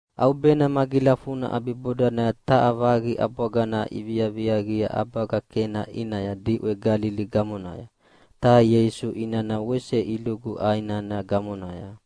ʼAubena magilafuna ʼabibodanaya taha vaqi ʼabwagana iviaviaqia ʼabaga Kena ʼinaya diʼwe Galili gamonaya, ta Ieisu inana wese ilugu ʼai nana gamonaya.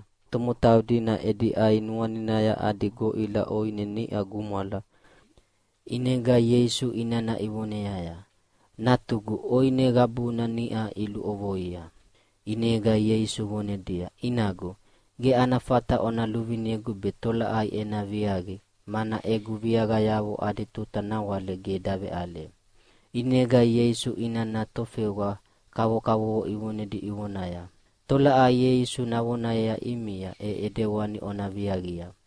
Ta tomotau dina edi ʼai nuaninaya adi goʼila ʼoine niʼa gumwala, ʼinega Ieisu inana ivoneaya, “Natugu, ʼoine qabuna niʼa iluʼovoia.” ʼInega Ieisu vonedia, “Inagu, ge ana fata ona luvinegu be tolaʼai ena viaqi, mana egu viaqayavo adi tuta nawale ge daveʼale.” ʼInega Ieisu inana tofewa kavovo ivonedi ivonaya, “Tolaʼai Ieisu navonayea ʼimia, e ʼedewani ona viaqia.”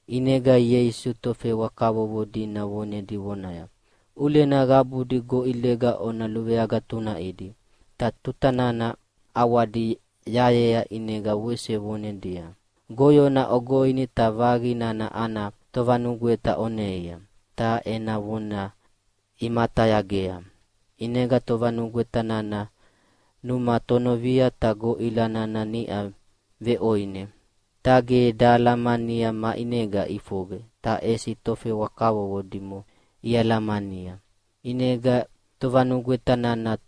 ʼInega Ieisu tofewa kavovo dina vonedi vonaya, “ʼUlena qabudi goʼilega ona luveagatunaʼidi!” Ta tuta nana ʼawadi yayea ʼinega wese vonedia, “Goyona ogoini ta vaqi nana ana tovanugweta oneia.” Ta ena vona imatayagea. ʼInega tovanugweta nana numa tonovia ta goʼila nana niʼa veʼoine. Ta ge dahalamania maʼinega ʼifoqe, ta ʼesi tofewa kavovo dimo ialamania. ʼInega tovanugweta nana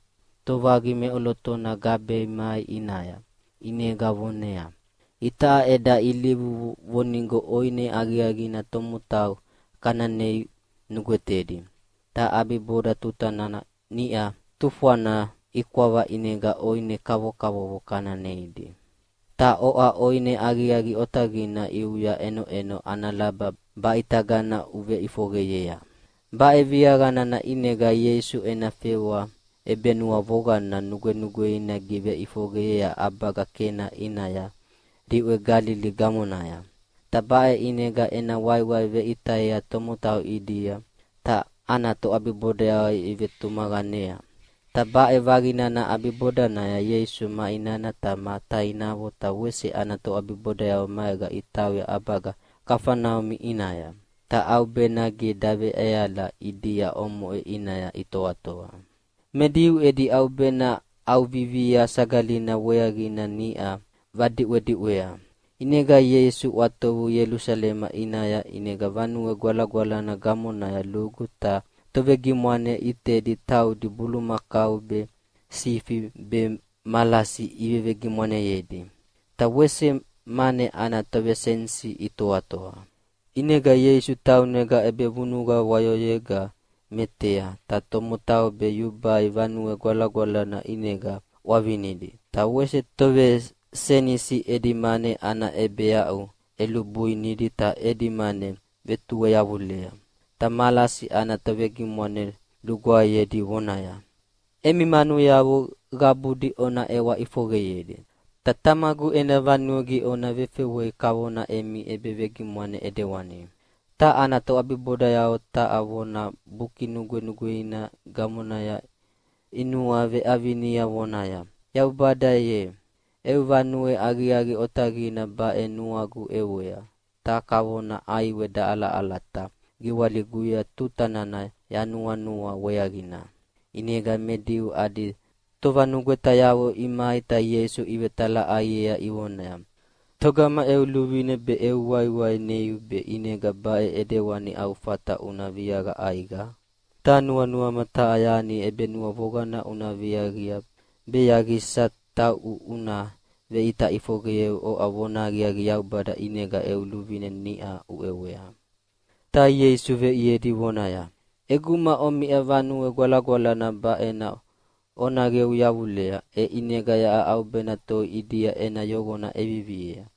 tovaqi meʼolotona gabea mai ʼinaya. ʼInega voneaya, “Itaʼa eda ilivu vonigo ʼoine aqiaqina tomotau kana nei nugwetedi, ta ʼabiboda tuta nana niʼa tufwana ikwava ʼinega ʼoine kavokavovo kana neidi. Ta oʼa ʼoine aqiaqi otaqina ʼiuya ʼenoʼeno ana laba baʼitagana uveʼifoqeyea?” Baʼe viaqa nana ʼinega Ieisu ena fewa ʼebenuavoqana nugwenugweina giveʼifoqeyea ʼabaga Kena ʼinaya diʼwe Galili gamonaya. Ta baʼe ʼinega ena waiwai veʼitayea tomotau ʼidia, ta ana toʼabibodayavo ivetumaqanea. Ta baʼe vaqi nana ʼabibodanaya Ieisu ma inana ta ma tainavo ta wese ana toʼabibodayavo maega itauya ʼabaga Kafaneumi ʼinaya. Ta ʼaubena ge daveʼeala ʼidia omoʼe ʼinaya itoatoa. Me Diu edi ʼaubena ʼAuvivia Sagalina weaqina niʼa vadiʼwediʼwea. ʼInega Ieisu ʼwatovu Ielusalema ʼinaya. ʼInega Vanue Gwalagwalana gamonaya lugu ta tovegimwane ʼitedi taudi bulumakau be, sifi be malasi ivevegimwaneyedi. Ta wese mane ana tovesenisi itoatoa. ʼInega Ieisu taunega ʼebevunuqa wayoyega metea, ta tomotau be yubai Vanue Gwalagwalana ʼinega ʼwavinidi, ta wese tovesenisi edi mane ana ʼebeaʼu ʼelubuinidi ta edi mane vetueyavulea. Ta malasi ana tovegimwane lugwaeyedi vonaya, “Emi manuyavo qabudi ona ʼewa ʼifoqeyedi, ta Tamagu ena vanue ge ona vefewei kavona emi ʼebevegimwane ʼidewani.” Ta ana toʼabibodayavo taha vona Buki Nugwenugweina gamonaya inuaveʼavinia vonaya, “Yaubada ye, eu vanue aqiaqi otaqina baʼe nuagu ʼewea, ta kavona ʼaiwe daʼalaʼalata giwaliguya tuta nana yanuanua weaqina.” ʼInega me Diu adi tovanugwetayavo imai ta Ieisu ivetalaʼaiea ivonaya, “Togama eu luvine be eu waiwai neiu be ʼinega baʼe ʼidewani au fata una viaqa ʼaiqa? Ta nuanuama taha yani ʼebenuavoqana una viaqia be yaqisa tauʼu una veʼita ʼifoqeyeu oʼa vonahaqiaqi Yaubada ʼinega eu luvine niʼa uʼewea.” Ta Ieisu veʼiedi vonaya, “ʼEguma omiʼa Vanue Gwalagwalana baʼena ona qeu yavulea, e ʼinega yaʼa ʼaubena toi ʼidia ena yoqona ʼeviviea.”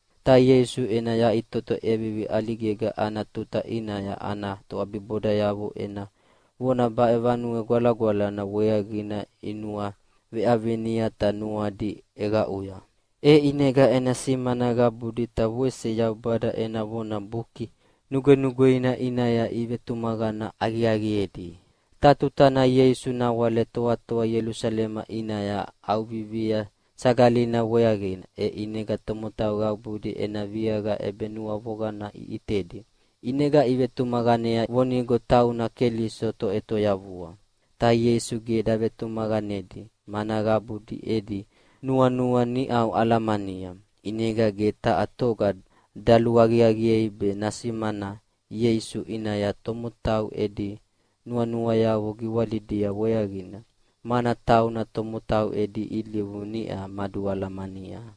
Ta Ieisu ena yaʼitoto ʼevivi ʼaligega ana tuta ʼinaya ana toʼabibodayavo ena vona baʼe Vanue Gwalagwalana weaqina inuaveʼavinia ta nuadi ʼeqaʼuya. E ʼinega ena simana qabudi ta wese Yaubada ena vona Buki Nugwenugweina ʼinaya ivetumaqana aqiaqiedi. Ta tutana Ieisu nawale toatoa Ielusalema ʼinaya ʼAuvivia Sagalina weaqina, e ʼinega tomotau qabudi ena viaqa ʼebenuavoqana iʼitedi, ʼinega ivetumaqanea vonigo tauna Keliso Toʼetoyavua. Ta Ieisu ge davetumaqanedi, mana qabudi edi nuanua niʼau alamania. ʼInega ge taha toga daluaqiaqiei be nasimana Ieisu ʼinaya tomotau edi nuanuayavo giwalidia weaqina, mana tauna tomotau edi ilivu niʼa madualamania.